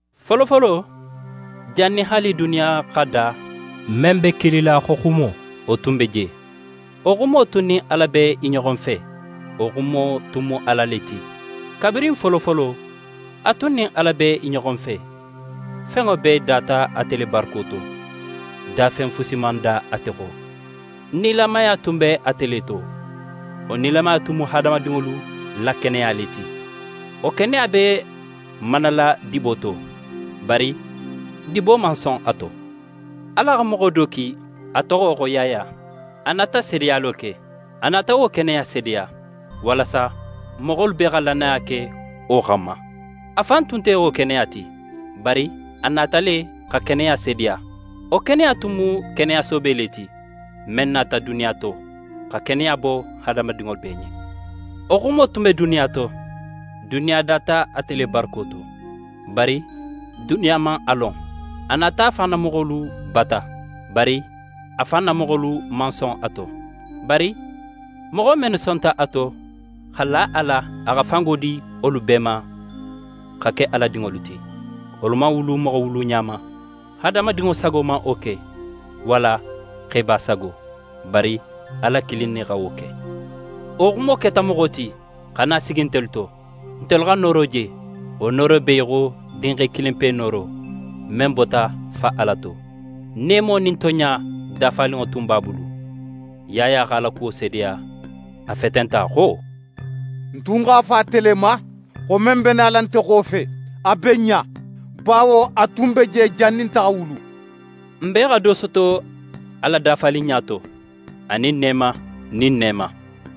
Folofolo, jannin haali duniya xa da, men be kilila xo Xumo, wo tun be je. Wo Xumo tun nin Ala be i ɲoxo fe, wo Xumo tun mu Ala le ti. Kabirin folofolo a tun nin Ala be i ɲoxo fe. Fenŋo bee data ate le barako to. Dafen fusi man da ate xo. Nilamaya tun be ate le to. Wo nilamaya tun mu hadamadinŋolu la keneya le ti. Wo keneya be manala dibo to, bari dibo man son a to. Ala xa moxo do ki, a toxo xo Yaya. A nata seedeyalo ke. A nata wo keneya seedeya, walasa moxolu bee xa lannaya ke wo xanma. A fan tun nte wo keneya ti, bari a nata le xa keneya seedeya. Wo keneya tun mu keneya soobe le ti, men nata duniya to, xa keneya bo hadamadinŋo bee ɲen. Wo Xumo tun be duniya to. Duniya data ate le barako to, bari duniya man a lon. A nata a fan na moxolu bata, bari a fan na moxolu man son a to. Bari moxo mennu sonta a to, xa la a la, a xa fango di wolu bee ma xa ke Ala dinŋolu ti. Wolu man wulu moxo wuluɲa ma, hadamadinŋo sago man wo ke, walla xeba sago, bari Ala kilin ne xa wo ke. Wo Xumo keta moxo ti, xa na sigi ntelu to. Ntelu x'a nooro je, wo nooro be í xo Dinxe kilinpe nooro, men bota Fa Ala to, neemo nin tonɲa dafaninŋo tun b'a bulu. Yaya x'a la kuwo seedeya, a fetenta xo: «Ń tun x'a fo ate le ma, xo men be nala nte xofe, a be ń ɲa; bawo a tun be je jannin nte xa wulu.» N bee xa do soto a la dafaninɲa to, anin neema nin neema.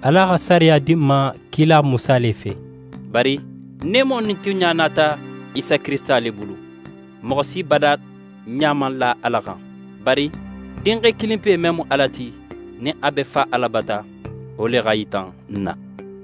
Ala xa sariya di n ma kila Musa le fe, bari neemo nin tonɲa nata Isa Kirisita le bulu. Moxo si bada ɲa man la Ala xan, bari Dinxe kilinpe men mu Ala ti, nin a be Fa Ala bata, wo le x'a yita n na.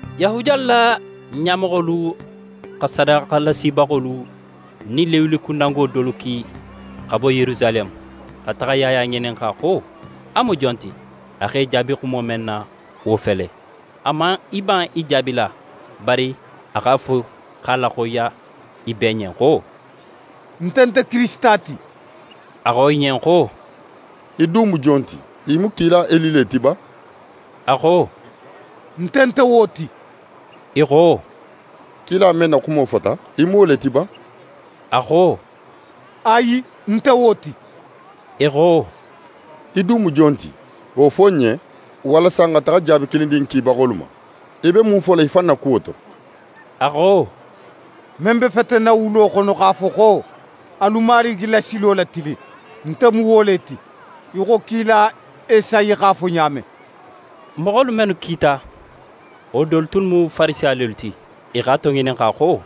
Yahudiyalu la ɲamoxolu xa sadaxalasibaxolu nin Lewikundango dolu ki xa bo Yerusaleme, xa taxa Yaya ŋininxa xo a mu jon ti. A x'e jaabi xumo men na, wo fele: A man i ban i jaabila, bari a x'a fo x'a laxoyiya i bee ɲen xo: «Nte nte Kirisita ti.» I xo a ɲen xo: «Í dun mu jon ti? Í mu kila Eli le ti ba?» A xo: «Nte nte wo ti.» I xo: «Kila men na xumo fota, í mu wo le ti ba?» A xo: «Ayi, ń nte wo ti.» I xo: «Í dun mu jon ti? Wo fo n ɲen, walasa n xa taxa jaabi kilin di n kibaxolu ma. Í be mun fola í fan na kuwo to?» A xo: «Men be fetenna wulo xono x'a fo xo: “Alu Marigi la silo latilin!” Nte mu wo le ti, í xo kila Esayi x'a fo ɲa men.» Moxolu mennu kita, wo dolu tunnu mu Farisiya lelu ti. I x'a toŋininxa xo: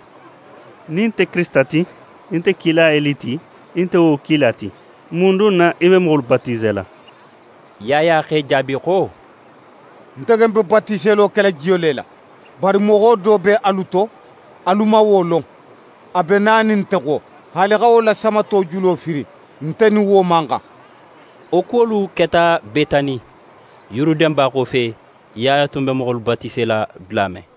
«Nin í nte Kirisita ti, í nte kila Eli ti, í nte wo kila ti, mun dun na í be moxolu batisela?» Yaya x'e jaabi xo: «Nte ken be batiselo kela jiyo le la. Bari moxo do be alu to, alu man wo lon. A be nanin nte xo. Haali xa wo la samato julo firin, nte nin wo man xan.» Wo kuwolu keta Betani, Yuruden ba xofe, Yaya tun be moxolu batisela dula men.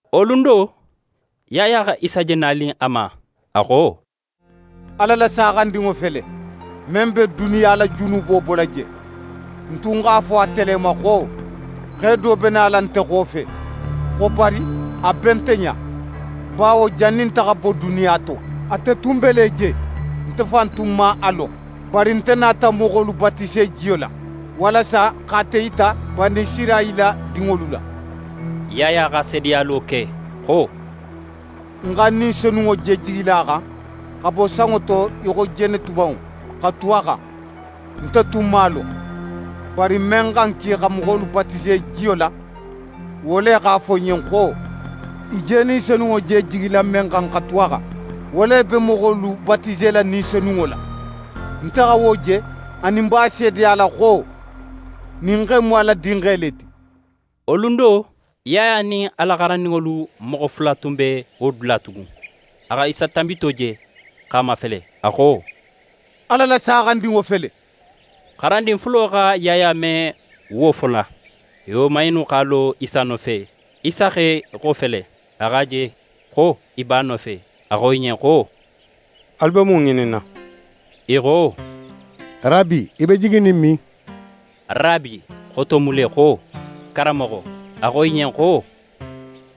Wo lun do, Yaya xa Isa je nanin a ma, a xo: «Ala la Saaxandinŋo fele, men be duniya la junubo bola je. Ń tun x'a fo ate le ma xo xe do be nala nte xofe, xo bari, a be nte ɲa, bawo jannin nte xa bo duniya to, ate tun be le je. Nte fan tun man a lon. Bari nte nata moxolu batise jiyo la, walasa x'ate yita Banisirayila dinŋolu la.» Yaya xa seedeyalo ke xo: «Ń xa Ni Senunŋo je jigila a xan xa bo sanŋo to í xo jenetubanŋo, xa tu a xan. Nte tun man a lon, bari men xa ń ki xa moxolu batise jiyo la, wo le x'a fo ń ɲen xo: “Í je Ni Senunŋo je jigila men xan xa tu a xan, wo le be moxolu batisela Ni Senunŋo la.” Nte xa wo je anin ń b'a seedeyala xo ɲin xe in mu Ala Dinxe le ti.» Wo lun do, Yaya nin a la xarandinŋolu moxo fula tun be wo dula tugun. A xa Isa tanbito je, x'a mafele, a xo: «Ala la Saaxandinŋo fele.» Xarandin fulo xa Yaya me wo fola, i woman innu x'a lo Isa nofe. Isa x'é xofele. A x'a je xo i b'a nofe. A xo i ɲen xo: «Alu be mun ŋininna?» I xo: «Rabi, í be jiginin min?» «Rabi» xoto mu le xo «Karanmoxo». A xo i ɲen xo: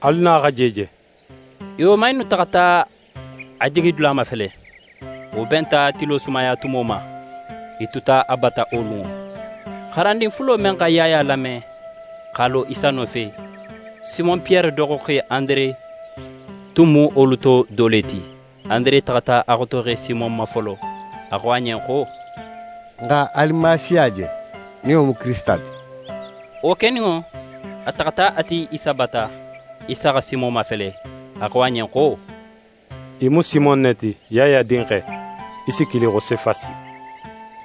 «Alu na, xa je je.» I woman innu taxata a jigidula mafele. Wo benta tilo sumayatumo ma. I tuta a bata wo lunŋo. Xarandin fulo men xa Yaya lame, x'a lo Isa nofe, Simon Piyere doxoxe Andere tun mu wolu to do le ti. Andere taxata a xotoxe Simon ma folo, a xo a ɲen xo: «N xa Alimasiya je, nin wo mu Kirisita ti.» Wo keninŋo, a taxata a ti Isa bata. Isa xa Simon mafele, a xo a ɲen xo: «Í mu Simon ne ti, Yaya dinxe. Í si kili xo: Sefasi».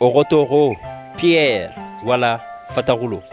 Wo xoto xo «Piyere» walla «fataxulo».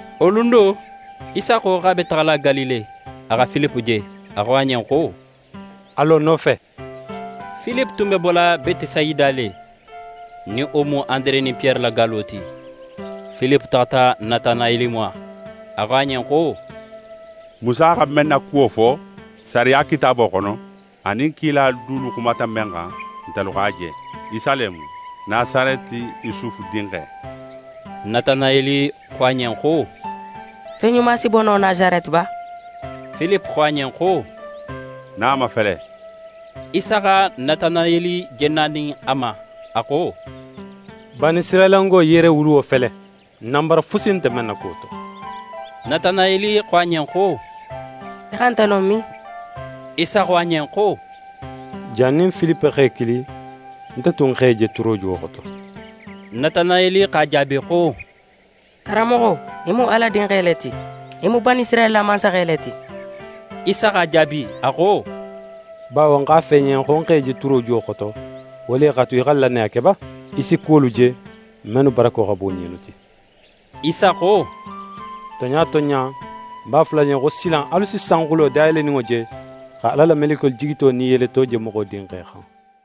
Wo lun do, Isa xo x'a be taxala Galile. A xa Filipe je, a xo a ɲen xo: «A lo ń nofe!» Filipe tun be bola Betesayida le, nin wo mu Andere nin Piyere la gallo ti. Filipe taxata Natanayeli ma, a xo a ɲen xo: «Musa xa men na kuwo fo Sariya kitaabo xono anin kilalu dulu xumata men xan, ntelu x'a je. Isa le mu, Nasareti Yusufu dinxe.» Natanayeli xo a ɲen xo: «Fen ɲuma si bo no Nasareti ba?» Filipe xo a ɲen xo: «Na a mafele.» Isa xa Natanayeli je nanin a ma, a xo: «Banisirayilango yeerewuluwo fele, nanbara fusi nte men na kuwo to.» Natanayeli xo a ɲen xo: «Í xa nte lon min?» Isa xo a ɲen xo: «Jannin Filipe x'é kili, nte tun x'é je turojuwo xoto.» Natanayeli x'a jaabi xo: «Karanmoxo, í mu Ala Dinxe le ti. Í mu Banisirayila mansaxe le ti.» Isa x'a jaabi, a xo: «Bawo ń x'a fo í ɲen xo ń x'é je turojuwo xoto, wo le x'a tu í xa lannaya ke ba? Í si kuwolu je mennu barako xa bun ɲinnu ti.» Isa xo: «Tonɲa tonɲa, ń b'a fola alu ɲen xo silan alu si sanxulo dayeleninŋo je, xa Ala la melekiyolu jigito nin i yeleto je Moxo Dinxe xan.»